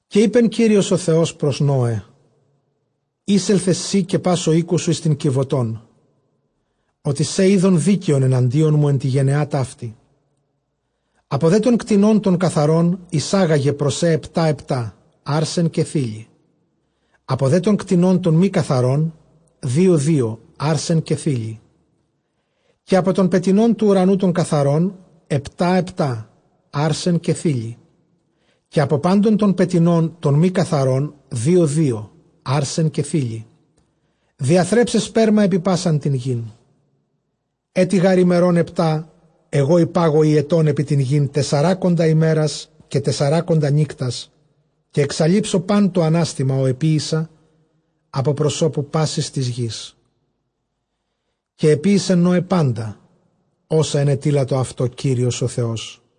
Καὶ εἶπε Κύριος ὁ Θεὸς πρὸς Νῶε, εἴσελθε σὺ καὶ πᾶς ὁ οἶκός σου εἰς τὴν κιβωτὸν, ὅτι σὲ εἶδον δίκαιον ἐναντίον μου ἐν τῇ γενεᾷ ταύτῃ. Ἀπὸ δὲ τῶν κτηνῶν τῶν καθαρῶν εἰσάγαγε πρὸς σὲ ἑπτὰ ἑπτὰ ἄρσεν καὶ θῆλυ, ἀπὸ δὲ τῶν κτηνῶν τῶν μὴ καθαρῶν δύο δύο ἄρσεν καὶ θῆλυ. Καὶ ἀπὸ τῶν πετεινῶν τοῦ οὐρανοῦ τῶν καθαρῶν ἑπτὰ ἑπτὰ ἄρσεν καὶ θῆλυ, καὶ ἀπὸ πάντων τῶν πετεινῶν τῶν μὴ καθαρῶν δύο δύο ἄρσεν καὶ θῆλυ, διαθρέψαι σπέρμα ἐπὶ πᾶσαν τὴν γῆν. Ἔτι γὰρ ἡμερῶν ἑπτὰ ἐγὼ ἐπάγω ὑετὸν ἐπὶ τὴν γῆν, τεσσαράκοντα ἡμέρας καὶ τεσσαράκοντα νύκτας· καὶ ἐξαλείψω πᾶν τὸ ἀνάστημα, ὃ ἐποίησα ἀπὸ προσώπου πάσης τῆς γῆς. Καὶ ἐποίησε Νῶε πάντα, ὅσα ἐνετείλατο αὐτῷ Κύριος ὁ Θεός.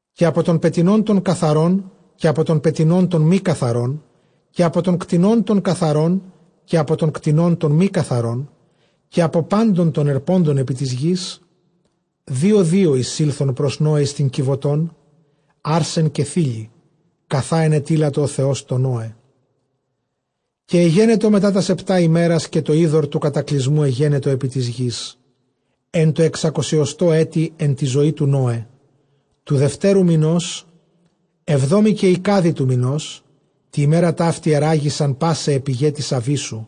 Καὶ ἀπὸ τῶν πετεινῶν τῶν καθαρῶν, καὶ ἀπὸ τῶν πετεινῶν τῶν μὴ καθαρῶν, καὶ ἀπὸ τῶν κτηνῶν τῶν καθαρῶν, καὶ ἀπὸ τῶν κτηνῶν τῶν μὴ καθαρῶν, καὶ ἀπὸ πάντων τῶν ἑρπόντων ἐπὶ τῆς γῆς, δύο δύο εἰσῆλθον πρὸς Νῶε εἰς τὴν κιβωτὸν ἄρσεν καὶ θῆλυ, καθὰ ἐνετείλατο ὁ Θεὸς τῷ Νῶε. Καὶ ἐγένετο μετὰ τὰς ἑπτὰ ἡμέρας, καὶ τὸ ὕδωρ τοῦ κατακλυσμοῦ ἐγένετο ἐπὶ τῆς γῆς. Ἐν τῷ ἑξακοσιοστῷ ἔτει ἐν τῇ ζωῇ τοῦ Νῶε, τοῦ δευτέρου μηνὸς, ἑβδόμῃ καὶ εἰκάδι τοῦ μηνὸς, τῇ ἡμέρᾳ ταύτῃ ἐῤῥάγησαν πᾶσαι αἱ πηγαὶ τῆς ἀβύσσου,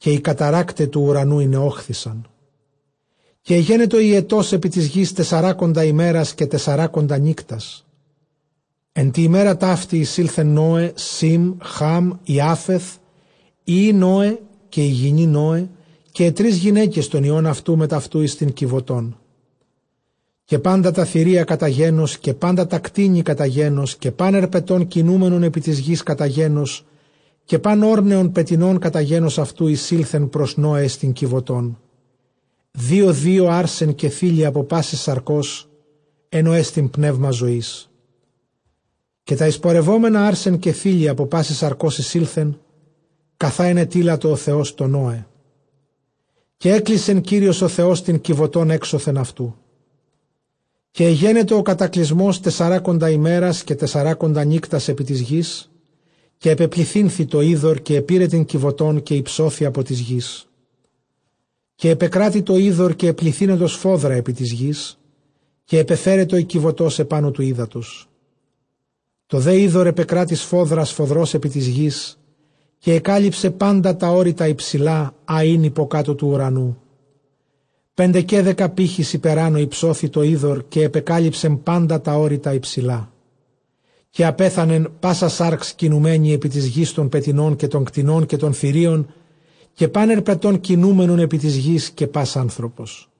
καὶ οἱ καταῤῥάκται τοῦ οὐρανοῦ ἠνεῴχθησαν. Καὶ ἐγένετο ὁ ὑετὸς ἐπὶ τῆς γῆς τεσσαράκοντα ἡμέρας καὶ τεσσαράκοντα νύκτας. Ἐν τῇ ἡμέρᾳ ταύτῃ εἰσῆλθε Νῶε, Σὴμ, Χὰμ, Ἰάφεθ, οἱ υἱοὶ Νῶε, καὶ ἡ γυνὴ Νῶε, καὶ αἱ τρεῖς γυναῖκες τῶν υἱῶν αὐτοῦ μετʼ αὐτοῦ, εἰς τὴν κιβωτόν. Καὶ πάντα τὰ θηρία κατὰ γένος, καὶ πάντα τὰ κτήνη κατὰ γένος, καὶ πᾶν ἑρπετὸν κινούμενον ἐπὶ τῆς γῆς κατὰ γένος, καὶ πᾶν ὄρνεον πετεινὸν κατὰ γένος αὐτοῦ, εἰσῆλθον πρὸς Νῶε εἰς τὴν κιβωτὸν, δύο δύο ἄρσεν καὶ θῆλυ ἀπὸ πάσης σαρκὸς, ἐν ᾧ ἐστι πνεῦμα ζωῆς. Καὶ τὰ εἰσπορευόμενα ἄρσεν καὶ θῆλυ ἀπὸ πάσης σαρκὸς εἰσῆλθε, καθὰ ἐνετείλατο ὁ Θεὸς τῷ Νῶε· καὶ ἔκλεισε Κύριος ὁ Θεὸς τὴν κιβωτὸν ἔξωθεν αὐτοῦ. Καὶ ἐγένετο ὁ κατακλυσμὸς τεσσαράκοντα ἡμέρας καὶ τεσσαράκοντα νύκτας ἐπὶ τῆς γῆς· καὶ ἐπεπληθύνθη τὸ ὕδωρ· καὶ ἐπῇρε τὴν κιβωτὸν, καὶ ὑψώθη ἀπὸ τῆς γῆς. Καὶ ἐπεκράτει τὸ ὕδωρ, καὶ ἐπληθύνετο σφόδρα ἐπὶ τῆς γῆς· καὶ ἐπεφέρετο ἡ κιβωτὸς ἐπάνω τοῦ ὕδατος. Τὸ δὲ ὕδωρ ἐπεκράτει σφόδρα σφόδρα ἐπὶ τῆς γῆς· καὶ ἐκάλυψε πάντα τὰ ὄρη τὰ ὑψηλὰ, ἃ ἦν ὑποκάτω τοῦ οὐρανοῦ. Πεντεκαίδεκα πήχεις ὑπεράνω ὑψώθη τὸ ὕδωρ· καὶ ἐπεκάλυψε πάντα τὰ ὄρη τὰ ὑψηλά. Καὶ ἀπέθανε πᾶσα σὰρξ κινουμένη ἐπὶ τῆς γῆς τῶν πετεινῶν, καὶ τῶν κτηνῶν, καὶ τῶν θηρίων· καὶ πᾶν ἑρπετὸν κινούμενον ἐπὶ τῆς γῆς, καὶ πᾶς ἄνθρωπος.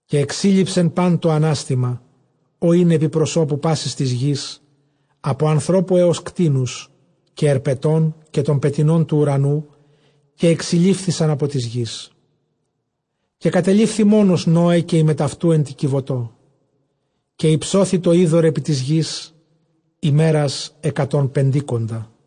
Καὶ ἐξήλειψε πᾶν τὸ ἀνάστημα, ὃ ἦν ἐπὶ προσώπου τῆς γῆς, ἀπὸ ἀνθρώπου ἕως κτήνους, καὶ ἑρπετῶν, καὶ τῶν πετεινῶν τοῦ οὐρανοῦ· καὶ ἐξηλείφησαν ἀπὸ τῆς γῆς· καὶ κατελείφθη μόνος Νῶε, καὶ οἱ μετʼ αὐτοῦ ἐν τῇ κιβωτῷ. Καὶ ὑψώθη τὸ ὕδωρ ἐπὶ τῆς γῆς ἡμέρας ἑκατὸν πεντήκοντα.